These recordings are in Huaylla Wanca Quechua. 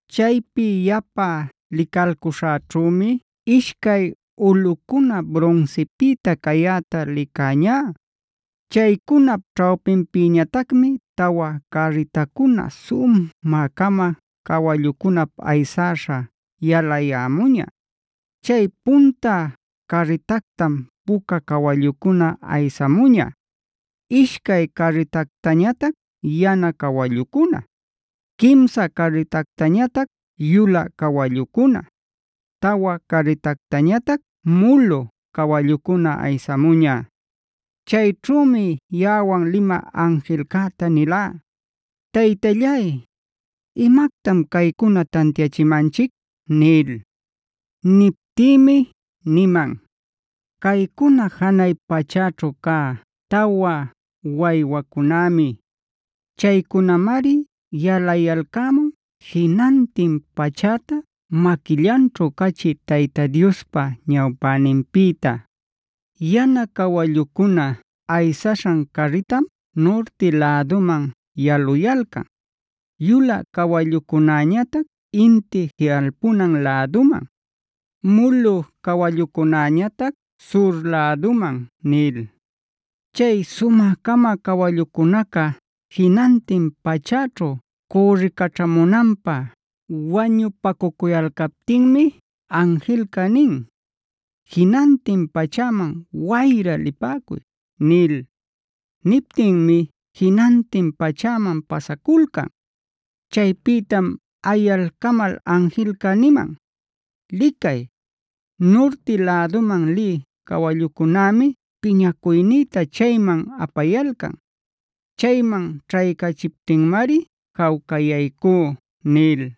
Chaypi yapa licalcuśhäćhümi ishcay ulꞌucuna brunsipïta cayäta licäñá. Chaycunap ćhawpinpïñatacmi tawa carritacuna sumä-cama cawallucunap aysäśha yalayämuña. Chay punta carritactam puca cawallucuna aysamuña, ishcay carritactañatac yana cawallucuna, quimsa carritactañatac yulä cawallucuna, tawa carritactañatac mulu cawallucuna aysamuña. Chayćhümi yaꞌawan limä anjilcäta nilá: “Taytallay, ¿imactam caycuna tantiachimanchic?” nil. Niptïmi niman: “Caycuna janay pachäćhu cä tawa waywacunämi. Chaycunamari yalayalcämun jinantin pachäta maquillanćhu cachï Tayta Diospa ñawpäninpïta. Yana cawallucuna aysaśhan carritam nurti läduman yaluyalcan, yulä cawallucunäñatac inti jiꞌalpunan läduman, mulu cawallucunäñatac sur läduman” nil. Chay sumä-cama cawallucunaca jinantin pachäćhu cürricaćhamunanpä wañupacucuyalcaptinmi anjilca nin: “Jinantin pachäman wayra lipäcuy” nil. Niptinmi jinantin pachäman pasaculcan. Chaypïtam ayalcamal anjilca niman: “Licay, nurti läduman lï cawallucunämi piñacuynïta chayman apayalcan. Chayman ćhaycachiptinmari jawcayaycú” nil.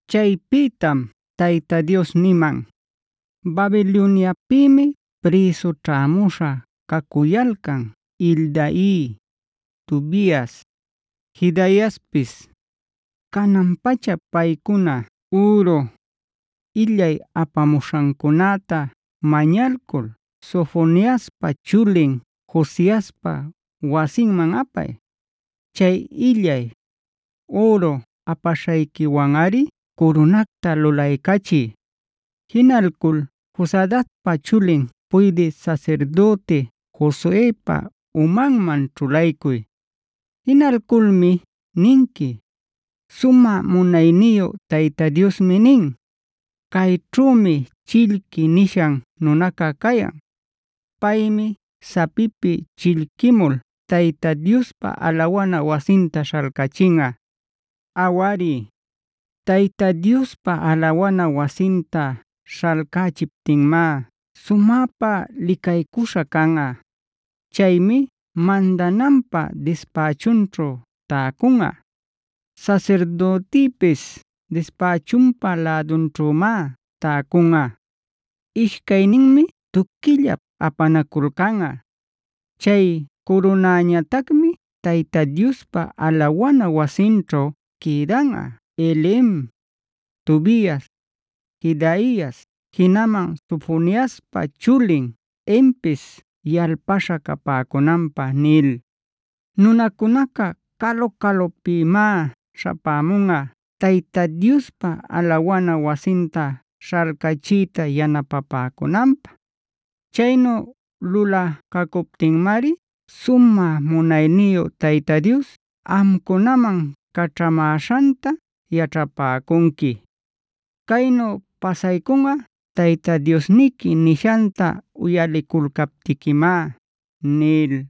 Chaypïtam Tayta Dios niman: “Babiloniapïmi prïsu ćhämuśha cacuyalcan Heldai, Tobias, Jedaiaspis. Canan-pacha paycuna üru, illay apapämuśhancunäta mañalcul Sofoniaspa chulin Josiaspa wasinman apay. Chay illay, üru apaśhayquiwanꞌari curunacta lulaycachiy. Jinalcul Josadacpa chulin puydï sasirdüti Josuepa umanman ćhulaycuy. Jinalculmi ninqui: ‘Sumä munayniyu Tayta Diosmi nin: Cayćhümi “Chillqui” nishan nunaca cayan. Paymi sapipi chillquimul Tayta Diospa alawana wasinta śhalcachinꞌa. Awari, Tayta Diospa alawana wasinta śhalcachiptinmá sumäpa licaycuśha canꞌa. Chaymi mandananpä dispächunćhu täcunꞌa; sasirdütipis dispächunpa lädunćhümá täcunꞌa. Ishcayninmi tuquillap apanaculcanꞌa. Chay curunañatacmi Tayta Diospa alawana wasinćhu quïdanꞌa Helem, Tobias, Jedaias, jinaman Sofoniaspa chulin Henpis yalpaśha capäcunanpä’ nil. “Nunacunaca calu-calucunapïmá śhapämunꞌa Tayta Diospa alawana wasinta śhalcachiyta yanapapäcunanpä. Chaynu lulacacuptinmari sumä munayniyu Tayta Dios amcunaman caćhamäśhanta yaćhapäcunqui. Caynu pasaycunꞌa Tayta Diosniqui nishanta uyaliculcaptiquimá” nil.